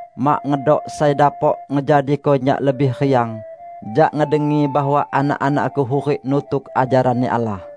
Mak ngedok sai dapok ngejadiko nyak lebih riang, jak ngedengi bahwa anak-anakku hurik nutuk ajaran-Ni Allah.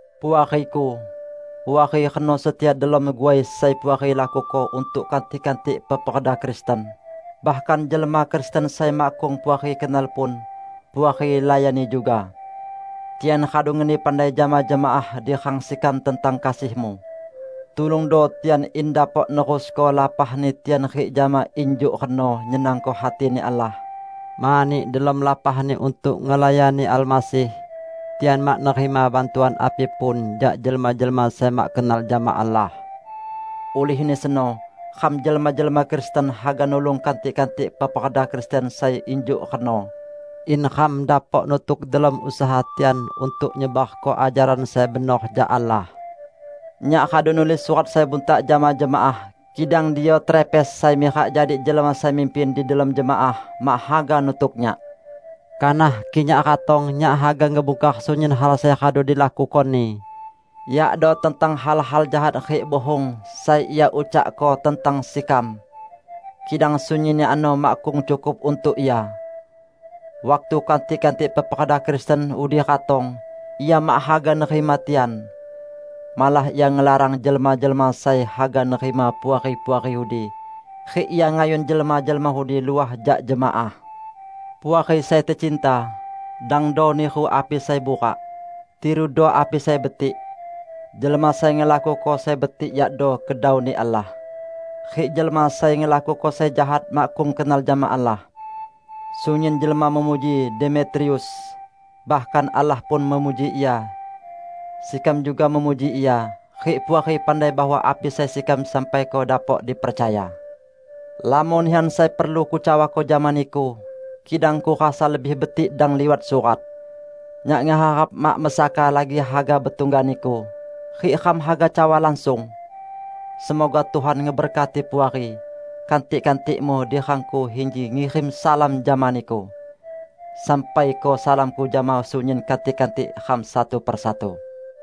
Puariku! Puari reno setia delom guai sai Puari lakuko untuk kantik-kantik peperda Kristen; bahkan jelma Kristen sai makkung Puari kenal pun, Puari layani juga. Tian radu ngeni pandai jama jemaah di rang sekam tentang kasihmu. Tulungdo tian in dapok nerusko lapahni tian rik jama injuk reno nyenangko hati-Ni Allah, mani delom lapahni untuk ngelayani Almasih, tian mak nerima bantuan api pun jak jelma-jelma sai mak kenal jama Allah. Ulihni seno, ram jelma-jelma Kristen haga nulung kantik-kantik peperda Kristen sai injuk reno, in ram dapok nutuk delom usaha tian untuk nyebarko ajaran sai benor jak Allah. Nyak radu nulis surat sai buntak jama jemaah, kidang Diotrefes sai mirak jadi jelma sai mimpin di delom jemaah, mak haga nutuk nyak. Kanah kik nyak ratong, nyak haga ngebungkar sunyin hal sai radu dilakukoni, yakdo tentang hal-hal jahat rik buhung sai ia ucakko tentang sekam! Kidang sunyinni ano makkung cukup untuk ia. Waktu kantik-kantik peperda Kristen udi ratong, ia mak haga nerima tian. Malah ia ngelarang jelma-jelma sai haga nerima puari-puari udi, rik ia ngayun jelma-jelma udi luah jak jemaah! Puari sai tecinta, dangdo niru api sai burak. Tirudo api sai betik. Jelma sai ngelakuko sai betik yakdo kedau-Ni Allah. Rik jelma sai ngelakuko sai jahat makkung kenal jama Allah. Sunyin jelma memuji Demetrius. Bahkan Allah pun memuji ia. Sekam juga memuji ia, rik Puari pandai bahwa api sai sekam sampaiko dapok dipercaya. Lamon nihan sai perlu kucawako jama niku, kidang kurasa lebih betik dang liwat surat. Nyak ngeharap mak mesaka lagi haga betungga niku, rik ram haga cawa langsung. Semoga Tuhan ngeberkati Puari. Kantik-kantikmu di rangku inji ngirim salam jama niku. Sampaiko salamku jama sunyin kantik-kantik ram satu-persatu.